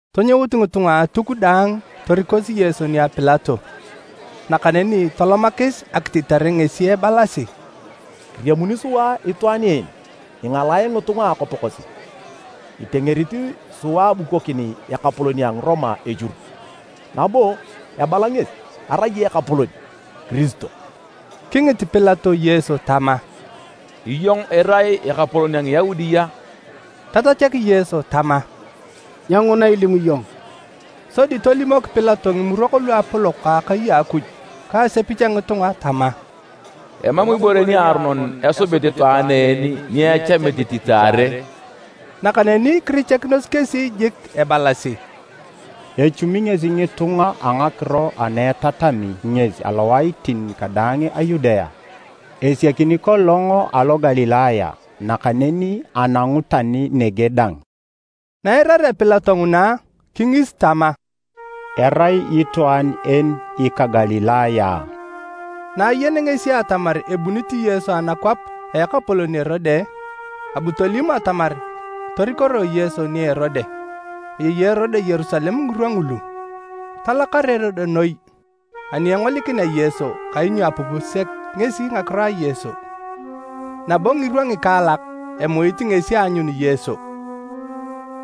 Tonyout ngitunga a Atuk daang torikosi Yesu nia Pilato. Nakaneni tolomakis akititare ngesi ebalasi: “Kiriamuni sua itwaan en ingalae ngitunga a akwap kosi, kitengerit sua abukonokin ekapolon a Ngiroma echur, nabo ebala ngesi arai ekapolon, Kiristo.” Kingit Pilato Yesu tama, “Iyong irai ekapolon a Ngiyaudi a?” Tatachak Yesu tama, “Nyenguna ilimu iyong.” Sodi tolimok Pilato Ngimurok Luapolok a akai a Akuj ka asepich a ngitunga tama, “Emam ibore niaronon esubit itwaan en ni echamit ititaare.” Nakaneni kirichakinos kesi jik ebalasi, “Echuumi ngesi ngitunga a ngakiro ana itatami ngesi alowaitin kadaang a Yudea. Esiakini kolong alo Galilaya, nakaneni anangu tani nege dang.” Na eirarea Pilato nguna, kingis tama, “Erai itwaan en ika Galilaya a?” Na ayenea ngesi atamar ebunit Yesu anakwap a ekapolon Erode, abu tolim atamar torikoroe Yesu nia Erode. Ayei Erode Yerusalem ngirwa ngulu. Talakar Erode noi ani engolikinea Yesu kainyo apupi sek ngesi ngakiro a Yesu, nabo ngirwa ngikaalak, emuit ngesi aanyun Yesu.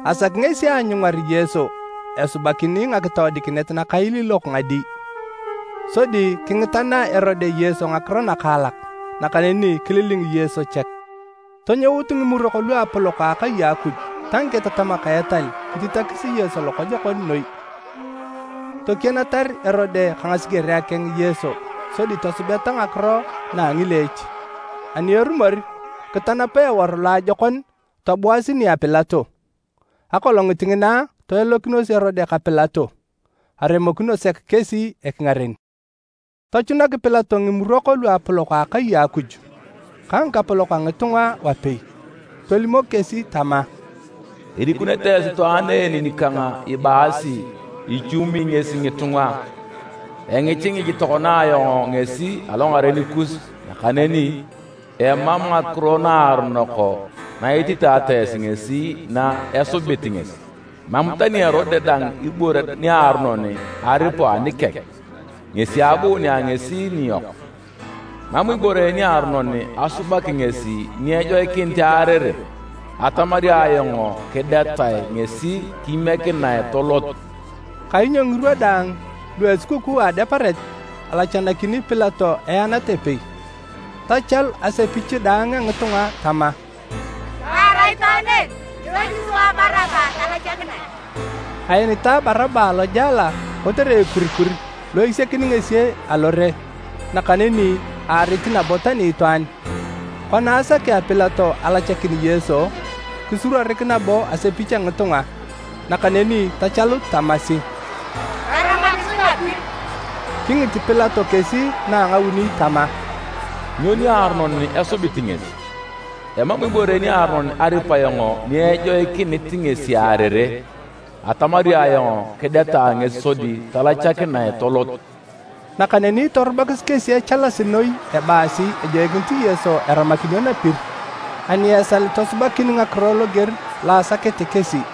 Asaki ngesi aanyungar Yesu esubakini ngakitoodikinet nakailiilok ngadi. Sodi kingitana Erode Yesu ngakiro nakaalak, nakaneni kililing Yesu chek. Tonyout Ngimurok Luapolok a akai a Akuj ta ngiketatamak a etal kititakis Yesu lokojokon noi. Tokienatar Erode ka ngasigerea keng Yesu sodi tosubeta ngakiro na a ngileech. Ani erumor, kitanapa eworu loajokon tobuasi nia Pilato. Akolongit ngina, toelokinos Erode ka Pilato, aremokino sek kesi ekingaren. Tochunak Pilato Ngimurok Luapolok a akai a Akuj ka ngikapolok a ngitunga wapei, tolimok kesi tama, “Irikunete esi itwaan en nikang ibaasi ichuumi ngesi ngitunga. Engichingich tokona ayong ngesi alongaren kus, nakaneni emam ngakiro naaronok na ititata esi ngesi na esubit ngesi. Emam tani Erode dang ibore niaronon aripu anikeng, ngesi abuunea ngesi niyok. Emam ibore niaronon asubaki ngesi ni ejoikinit earere. Atamari ayong kidetae ngesi kimiekinae tolot.” [ Kainyo ngirwa daang lua esukukuu a Adeparet, alachanakini Pilato eenat epei.] Tachalu asepich daang a ngitunga tama, “Taara itwaan en! Kisaki sua Baraba talachakinae!” ( Aenitae Baraba alojela kotere ekurikur lo esiakini ngesi alore, nakaneni aarit nabo tani itwaan.) Kona asakea Pilato alachakin Yesu, kisuruorik nabo asepich a ngitunga. Nakaneni tachalut tamasi, “Taramakisi napir!” Kingit Pilato kesi na a ngauni tama, “Nyo niaronon esubit ngesi? Emam ibore niaronon aripu ayong ni ejoikinit ngesi earere! Atamari ayong kidetae ngesi sodi talachakinae tolot.” Nakaneni torubakis kesi echalasi noi ebaasi ejoikinit Yesu eramakinio napir, ani esal tosubakin ngakiro loger lo asakete kesi.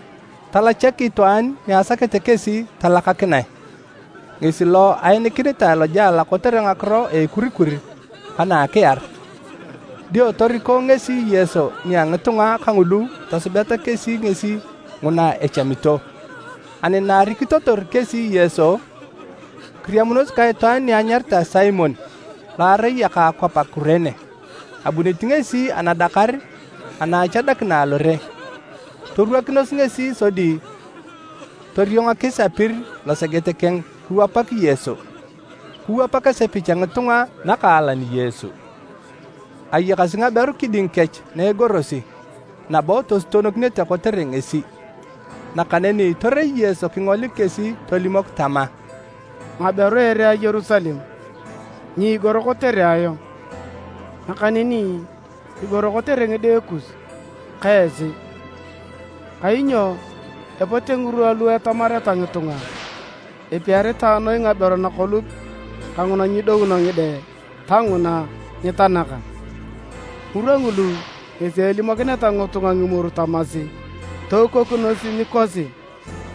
Talachak itwaan ni asakete kesi talachakinae, ngesi lo aenikinitae lojela kotere ngakiro a ekurikur ka na a akiar. Dio toriko ngesi Yesu nia ngitunga kangulu tosubeta kesi ngesi nguna echamito. Ani na arikitotor kesi Yesu, kiriamunos ka itwaan ni anyaritae Simon lo arai eka akwap a Kurene. Abunit ngesi anadakar ana achadakina alore. Torwakinos ngesi sodi toriongakis apir loseget keng kiwapak Yesu. Kiwapak asepich a ngitunga nakaalan Yesu. Ayakasi ngaberu kiding kech na egorosi, nabo tosutonokinete kotere ngesi. Nakaneni torei Yesu kingolik kesi tolimok tama, “Ngaberu a ere a Yerusalem! Nyiigor kotere ayong, nakaneni kigoro kotere ngide kus ka esi. Kainyo epote ngirwa lu etamareta ngitunga, ‘Epiaritae noi ngaberu nakolup ka nguna nyidouno ngide ta nguna nyitanaka!’ Ngirwa ngulu ngesi elimokineta ngitunga ngimoru tamasi, ‘Toukunos nikosi!’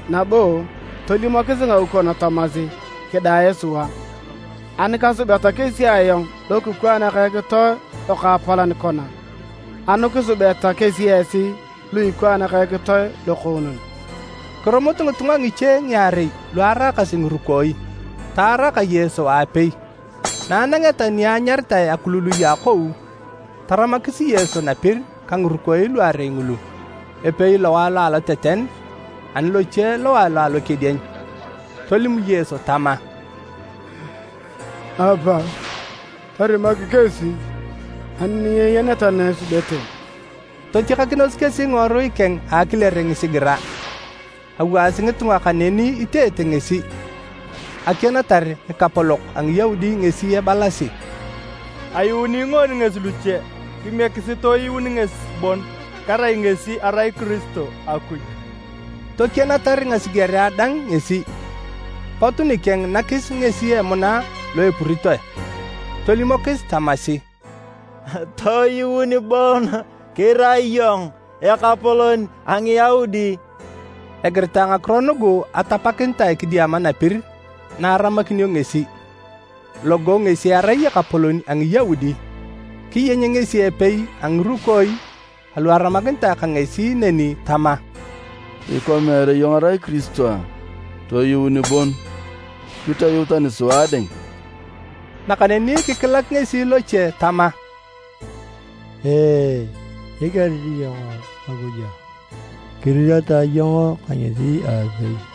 Nabo tolimokis ngaukon tamasi, ‘Kidae sua!’ Ani kasubeta kesi ayong lokikwaan ka ekitoe lokaapalan kona, anu kisubeta kesi esi lu ikwaan ka ekitoe lokoonon?” Kirumut ngitunga ngiche ngiarei lu araakasi ngirukooi, taara ka Yesu aapei. Na anangeta ni enyaritae, “Akulului a Akou”, taramakis Yesu napir ka ngirukooi luarei ngulu, epei lowae lo aloteten, ani loche lowae lo alokedieny. Tolim Yesu tama, “Apa! Torimak kesi ani nyeyeneta na esubete.” Totiakanakinos kesi ngiworui keng a akilere ngisigira. Awaasi ngitunga kaneni iteete ngesi, akienatar ngikapolok a Ngiyaudi ngesi ebalasi: “Ayuuni ngoon ngesi luche, kimiekisi toyuun ngesi bon, kerai ngesi erai Kiristo a Akuj!” Tokienatar ngasigerea dang ngesi. Pot nikeng nakis ngesi emuna lo epuritoe, tolimokis tamasi, “Toyuun bon kirai iyong ekapolon a Ngiyaudi!” Egiritae ngakiro nugu atapakinitae kidiama napir lo aramakinio ngesi, “Logo ngesi erai ekapolon a Ngiyaudi.” Kiyeny ngesi epei a ngirukooi alu aramakinitae ka ngesi neni tama: “Ikwa meere iyong irai Kiristo? Toyuun bon, kitoyuu tani sua dang!” Nakaneni kikilak ngesi loche tama, “Nyikerit iyong Akuj a? Kiriratae iyong ka ngesi aapei.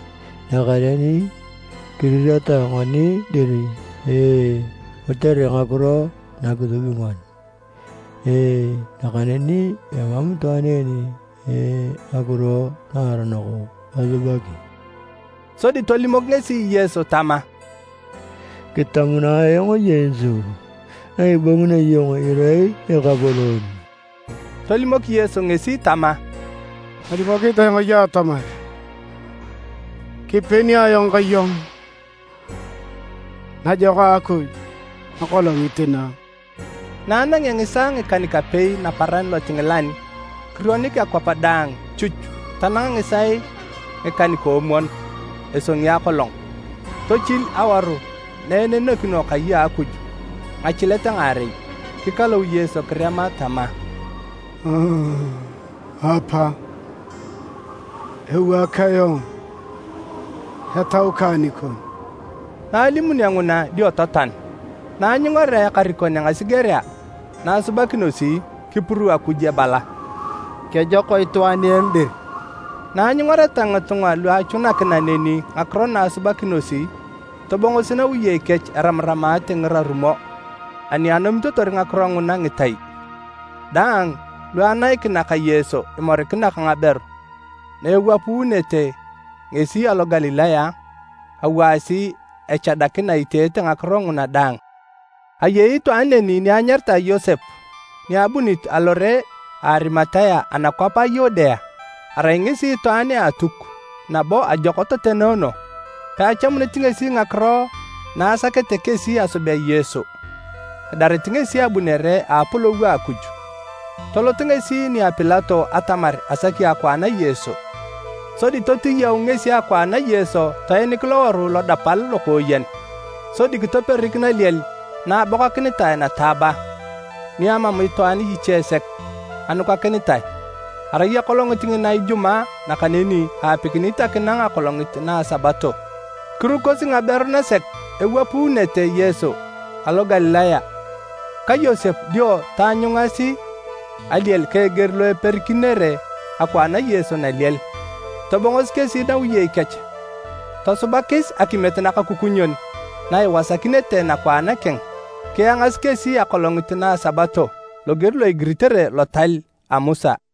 Nakaneni kiriratae ngoni dir kotere ngakiro na kisubi ngoni, nakaneni emam itwaan en ngakiro naaronok asubaki,” sodi tolimok ngesi Yesu tama, “Kitamunae ayong Yesu, na ibongunio iyong irai Ekapolon.” Tolimok Yesu ngesi tama, “Kalimokinit ayong iyong atamar kipeni ayong ka iyong najako a Akuj akolongit na!” Na anangea ngisaae ngikan-kapei naparan lotingilan, kirionik akwap daang chuch tanang ngisaae ngikan-koomwon esongi akolong. Tochil awaru na enenekino kai a Akuj ngachilet ngaarei. Kikalou Yesu kirema tama, “Apa! Ewaak ayong etau kang nikon!” Na alimunio nguna dio totoan. Na anyungarea ekarikon a ngasigerea na asubakinosi, kipuruu Akuj ebala, “Kejok itwaan en dir!” Na anyungareta ngitunga lu achunakina neni ngakiro na asubakinosi, tobongosi nawiyei kech eramaramate ngirarumo ani anomitotor ngakiro nguna ngitai. Daang lu anaikina ka Yesu imorikina ka ngaberu na ewapuunete ngesi alo Galilaya, awaasi echadakina iteete ngakiro nguna daang. Ayei itwaan neni ni anyaritae Yosep ni abunit alore a Arimatea anakwap a Yudea. Arai ngesi itwaan a Atuk, nabo ajok totenoono. Peachamunit ngesi ngakiro na asaket kesi asubea Yesu. Edarit ngesi abunere a Apolou a Akuj. Tolot ngesi nia Pilato atamar asaki akwaan a Yesu. Sodi totiyau ngesi akwaan a Yesu toenik loworu lodapal lokooyen, sodi kitoperik naliel na abokakinitae nataaba, ni amam itwaan iche sek anukakinitae. Arai akolongit ngina Ijumaa, nakaneni aapikinit akinang akolongit na a Sabato. Kirukosi ngaberu nasek ewapuunete Yesu alo Galilaya ka Yosep dio taanyungasi aliel ka eger lo eperikinere akwaan a Yesu naliel. Tobongosi kesi nawiyei kech tosubakis akimiet nakakukunyon na iwasakinete nakwaan keng. Kiangasi kesi akolongit na a Sabato loger lo igiritere lotal a Musa.